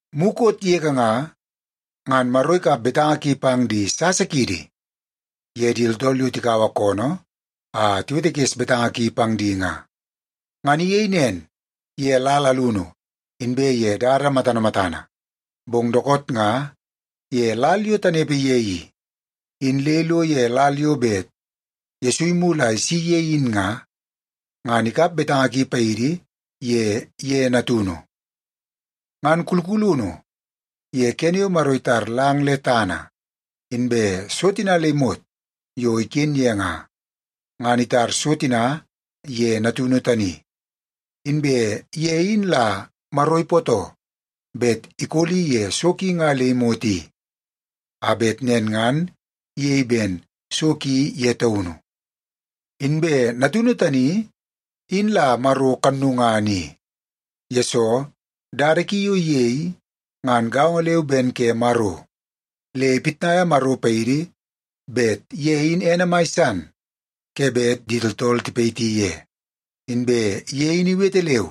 Mukot yege nga, ngan Maro ikap betanga ki pang di sasa kiidi ye di tooltool yo tikaua koonoo a tiwetekes betanga ki pang di nga. Ngan iyei nen ye lal alunu inbe ye dada matana matana, bong dookoot nga ye lal yo tanepe ye i, in le ilo ye lal yo bet Yesu imulu a isi ye in nga, ngan ikap betanga ki paidi ye ye Natunu. Ngan kulkulunu ye kene yo Maro itar lang le tana inbe so tina le imot yo iken ye nga, ngan itar so tina ye Natunu tani, inbe ye in la Maro ipootoo bet ikoli ye so ki nga le imot i, a bet nen ngan iyei ben so ki ye taunu. Inbe Natunu tani, in la Maro kannungana i, yesoo dada ki yo iyei ngan gaongo leu ben ke Maro, le ipitnaia Maro paidi bet ye in ene mai san ke bet di tooltool tipayiti ye. Inbe ye in iwete leu,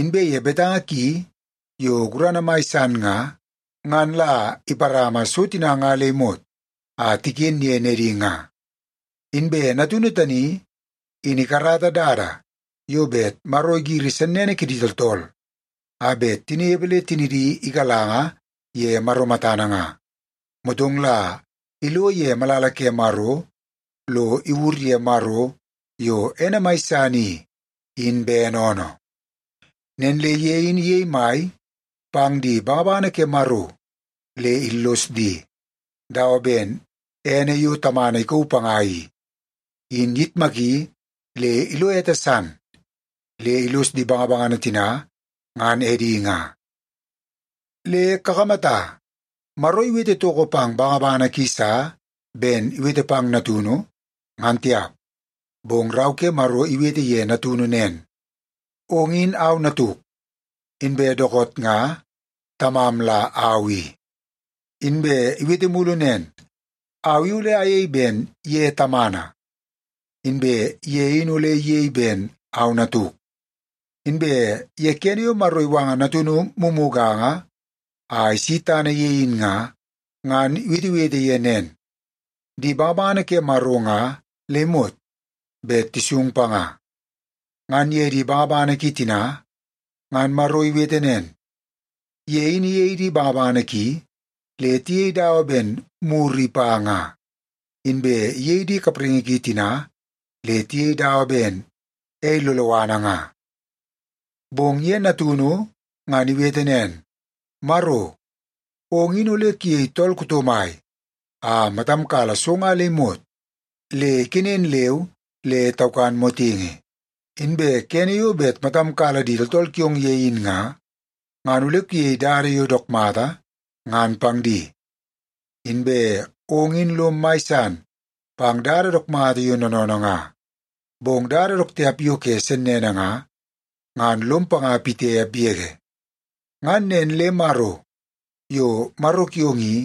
inbe ye betanga ki yo gurana mai san nga, ngan la iparama so tina nga le imot a tiken ye nedi nga. Inbe Natunu tani in ikarata dada yo bet Maro igiri sennene kidi tooltool a bet tinepe le tinidi igalanga ye Maro matana nga, motong la ilo ye malala ke Maro lo iwur ye Maro, yo ene mai san i, in bene oonoo. Nen le ye in iyei mai pang di bangabangana ke Maro le illos di, dawa ben ene yo Tamana ikauu panga i, in iyitmaki le ilo ete san, le illos di bangabangana tina ngan edi nga. Le kakamata, Maro iwete toko pang bangabangana ki sa ben iwete pang Natunu, ngan tiap. Bong Rau ke Maro iwete ye Natunu nen, “Ong in au Natuk, inbe dookoot nga Tamam la au i.” Inbe iwete mulu nen, “Au i ole ayei ben ye Tamana, inbe ye in ole iyei ben au Natuk.” Inbe ye kene yo Maro iwanga Natunu mumuganga a isi tana ye in nga, ngan iwetewete ye nen, “Di bangabangana ke Maro nga le imot bet tisung panga.” Ngan ye di bangabangana ki tina, ngan Maro iwete nen, “Ye in iyei di bangabangana ki le tiyei dawa ben muru ipa nga, inbe iyei di kapraingi ki tina le tiyei dawa ben ei loloana nga.” Bong ye Natunu ngan iwete nen, “Maro, ong in ole kuyei tool kuto mai a matam kala so nga le imot le ikenen leu le taukan motingi. Inbe kene yo bet matam kala di tooltool kiong ye in nga, ngan ole kuyei dada yo dook mata, ngan pang di. Inbe ong in lom mai san pang dada dook mata yo noonoonoo nga, bong dada dook tiap yo ke sennene nga, ngan lom panga pitiap yege. Ngan nen le Maro, yo Maro kiong i,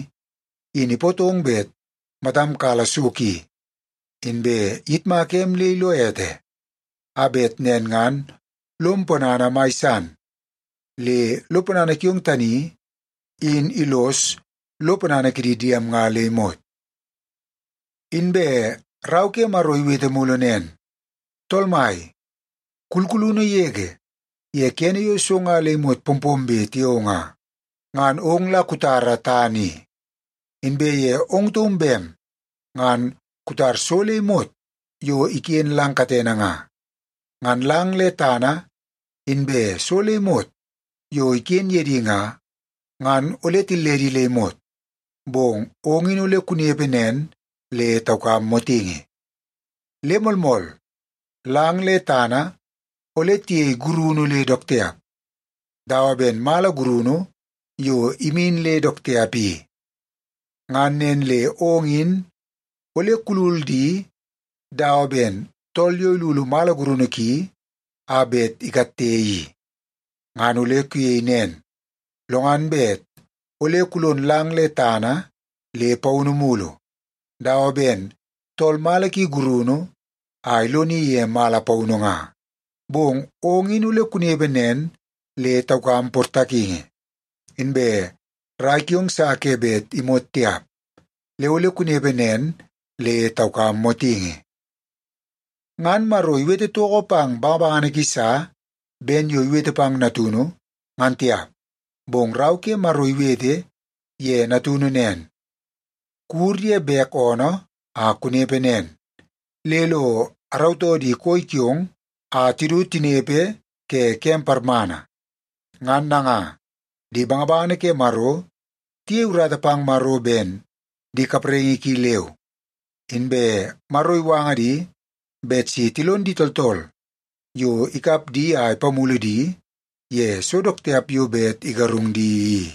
in ipootong bet matam kala so ki, inbe iyitmaka em le ilo ete, a bet nen ngan lom ponana mai san le lo ponana kiong tani in illos lo ponana kidi diem nga le imot.” Inbe Rau ke Maro iwete mulu nen, “Tool Mai, kulkulunu yege ye kene yo so nga le imot pompombe tiao nga, ngan ong la kutara tana i, inbe ye ong taum bem ngan kutar so le imot yo iken lang katene nga. Ngan lang le tana inbe so le imot yo iken ye di nga, ngan ole tilledi le imot, bong ong in ole kunepe nen le taukam motingi. Le moolmool, lang le tana ole tiyei gurunu le dook tiap, dawa ben mala gurunu yo imin le dook tiap i. Ngan nen le ong in ole kulul di dawa ben tool yo ilulu mala gurunu ki a bet ikatte i. Ngan ole kuyei nen, lo ngan bet ole kulon lang le tana le paunu mulu, dawa ben tool mala ki gurunu a iloni ye mala paunu nga. Bong ong in ole kunepe nen le taukam portakingi, inbe rai kiong sa ke bet imot tiap, le ole kunepe nen le taukam motingi.” Ngan Maro iwete toko pang bangabangana ki sa ben yo iwete pang Natunu, ngan tiap. Bong Rau ke Maro iwete ye Natunu nen, “Kuwur ye bek oonoo a kunepe nen, le lo arautoo di koi kiong a tidu tinepe ke kem parmana.” Ngan nanga, di bangabangana ke Maro tiyei urata pang Maro ben di kapraingi ki leu. Inbe Maro iwanga di bet si tilon di tooltool yo ikap di a apamulu di ye so dook tiap yo bet igarung di i.